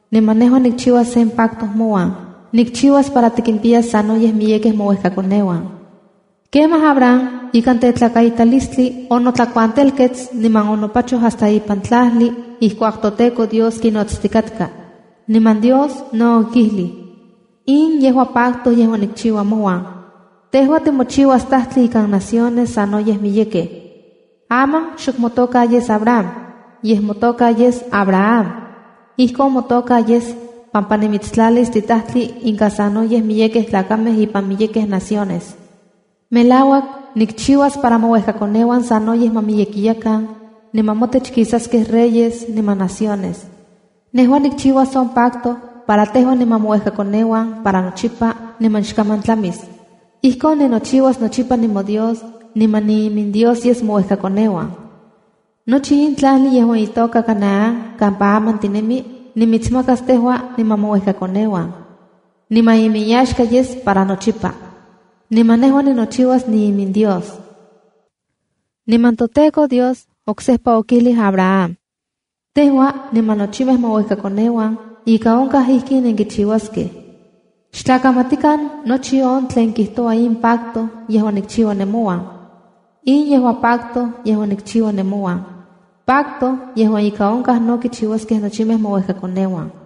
Niman nejua nikchiuas sen pacto mouan. Nikchiuas para tikimpiyas sanoyej miyekej mouejkakoneuan. Kemaj Abram ikan tetlakaitalistli onotlakuantelkets niman onopachoj hasta ipan tlajli ijkuak toTEKO Dios kinojnotstikatka. Niman Dios no okijlij: —In yejua pacto yejuan nikchiua mouan: Tejua timochiuas tajtli ikan naciones sanoyej miyekej. Aman xok motoka yes Abrama, yej motoka yes Abrahamb. Ijkon motoka yes pampa nimitstlalis titajtli inka sanoyej miyekej tlakamej ipan miyekej naciones. Melauak, nikchiuas para mouejkakoneuan sanoyej ma miyekiyakan, niman motech kisaskej reyes niman naciones. Nejua nikchiuas on pacto para tejua niman mouejkakoneuan para nochipa niman xkaman tlamis. Ijkon ninochiuas nochipa nimoDios niman niiminDios yes mouejkakoneuan. Nochi in tlajli yejuan itoka Canaán kampa aman tinemi, nimitsmakas tejua niman mouejkakoneuan. Niman inyaxka yes para nochipa, niman nejua ninochiuas niiminDios. Niman toTEKO Dios oksejpa okijlij Abraham: —Tejua niman nochimej mouejkakoneuan ika onkaj ijkin nenkichiuaskej. Xtlakamatikan nochi on tlen kijtoua in pacto yejuan nikchiua nemouan. In yejua pacto yejuan nikchiua nemouan, pacto yejuan ika onkaj no kichiuaskej nochimej mouejkakoneuan: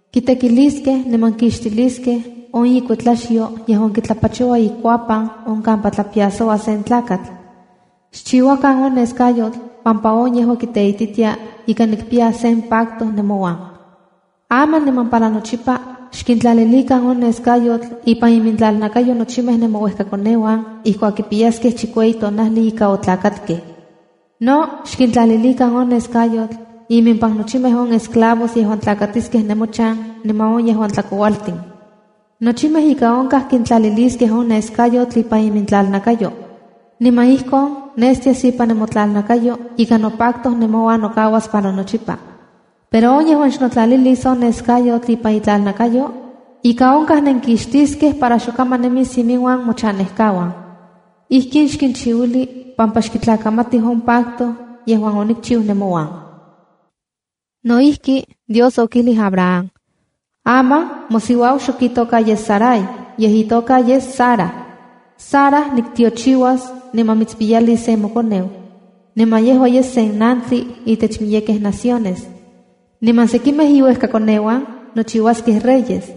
Kitekiliskej niman kixtilskej on ikuetlaxyo yejuan kitlapachoua ikuapan on kampa tlapiasoua sen tlakatl. Xchiuakan on neskayotl pampa on yejua kiteititia ika nikpiya sen pacto nemouan. Aman niman para nochipa, xkintlalilikan on nescayotl, ipan imintlalnakayo nochimej nemouejkakoneuan ijkuak kipiyaskej chikueyi tonajli ika otlakatkej. No xkintlalilikan on neskayotl impan nochimej on esclavos yejuan tlakatiskej nemochan niman on yejuan tlakoualtin. Nochimej ika onkaj kintlaliliskej on neskayotl ipan imintlalnakayo. Niman ijkon nestias ipan nemotlalnakayo ika nopacto nemouan nokauas para nochipa. Pero on yejuan xnotlalilis on neskayotl ipan itlalnakayo, ika onkaj nenkixtiskej para xokaman nemis iminuan mochanejkauan. Ijkin xchiuili pampa xkitlakamati on pacto yejuan onikchiu nemouan. No ijki, Dios okijlij Abraham: —Aman mosiuau xok itoka yes Sarai, yej itoka yes Sarac. Sara niktiochiuas, niman mitspiyalis sen mokoneu. Niman yejua yes nantli intech miyekej naciones, niman sekimej iuejkakoneuan nochiuaskej reyes.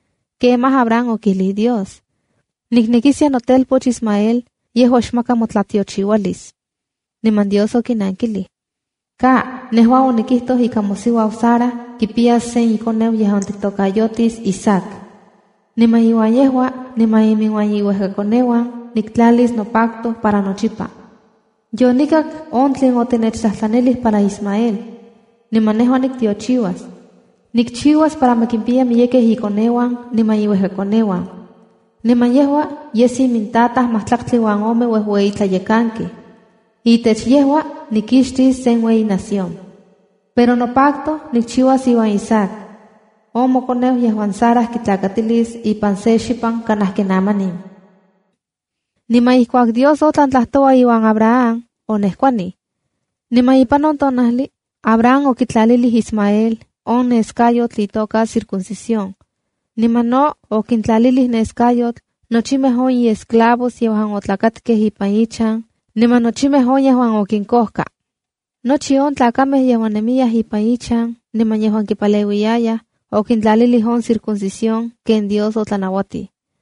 Kemaj Abraham okijlij Dios: —Niknekiskia notelpoch Ismael yejua xmaka motlatiochiualis. Niman Dios okinankilij: —¡Ka! Nejua onikijtoj ika mosiuau Sara kipiyas sen ikoneu yejuan tiktokayotis Isaac. Niman iuan yejua niman iminuan iuejkakoneuan niktlalis nopacto para nochipa. Yonikak on tlen otinechtlajtlanij para Ismael, niman nejua niktiochiuas. Nikchiuas para ma kimpiya miyekej ikoneuan niman iuejkakoneuan. Niman yejua yes imintataj majtlaktli uan ome uejueyitlayekankej. Itech yejua nikixtis sen ueyi nación. Pero nopacto nikchiuas iuan Isaac, on mokoneu yejuan Sara kitlakatilis ipan se xipan kanaj ken amanin. Niman ijkuak Dios otlan tlajtoua iuan Abraham, onejkuanij. Niman ipan on tonajli Abraham okitlalilij Ismael on neskayotl itoka circuncisión. Niman no okintlalilij neskayotl nochimej on iesclavos yejuan otlakatkaj ipan ichan niman nochimej on yejuan okinkojka. Nochi on tlakamej yejuan nemiyaj ipan ichan niman yejuan kipaleuiyayaj, okintlalilij on circuncisión ken Dios otlanauatij.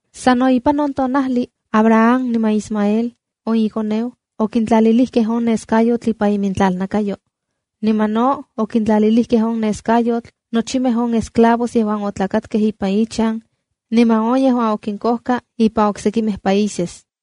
Sa no ipan on tonajli Abraham niman Ismael on ikoneu okintlalilijkej on neskayotl ipan imintlalnakayo. Niman no okintlalilijkej on neskayotl nochimej on esclavos yejuan otlakatkej ipan ichan niman on yejuan okinkojka ipan oksekimej países.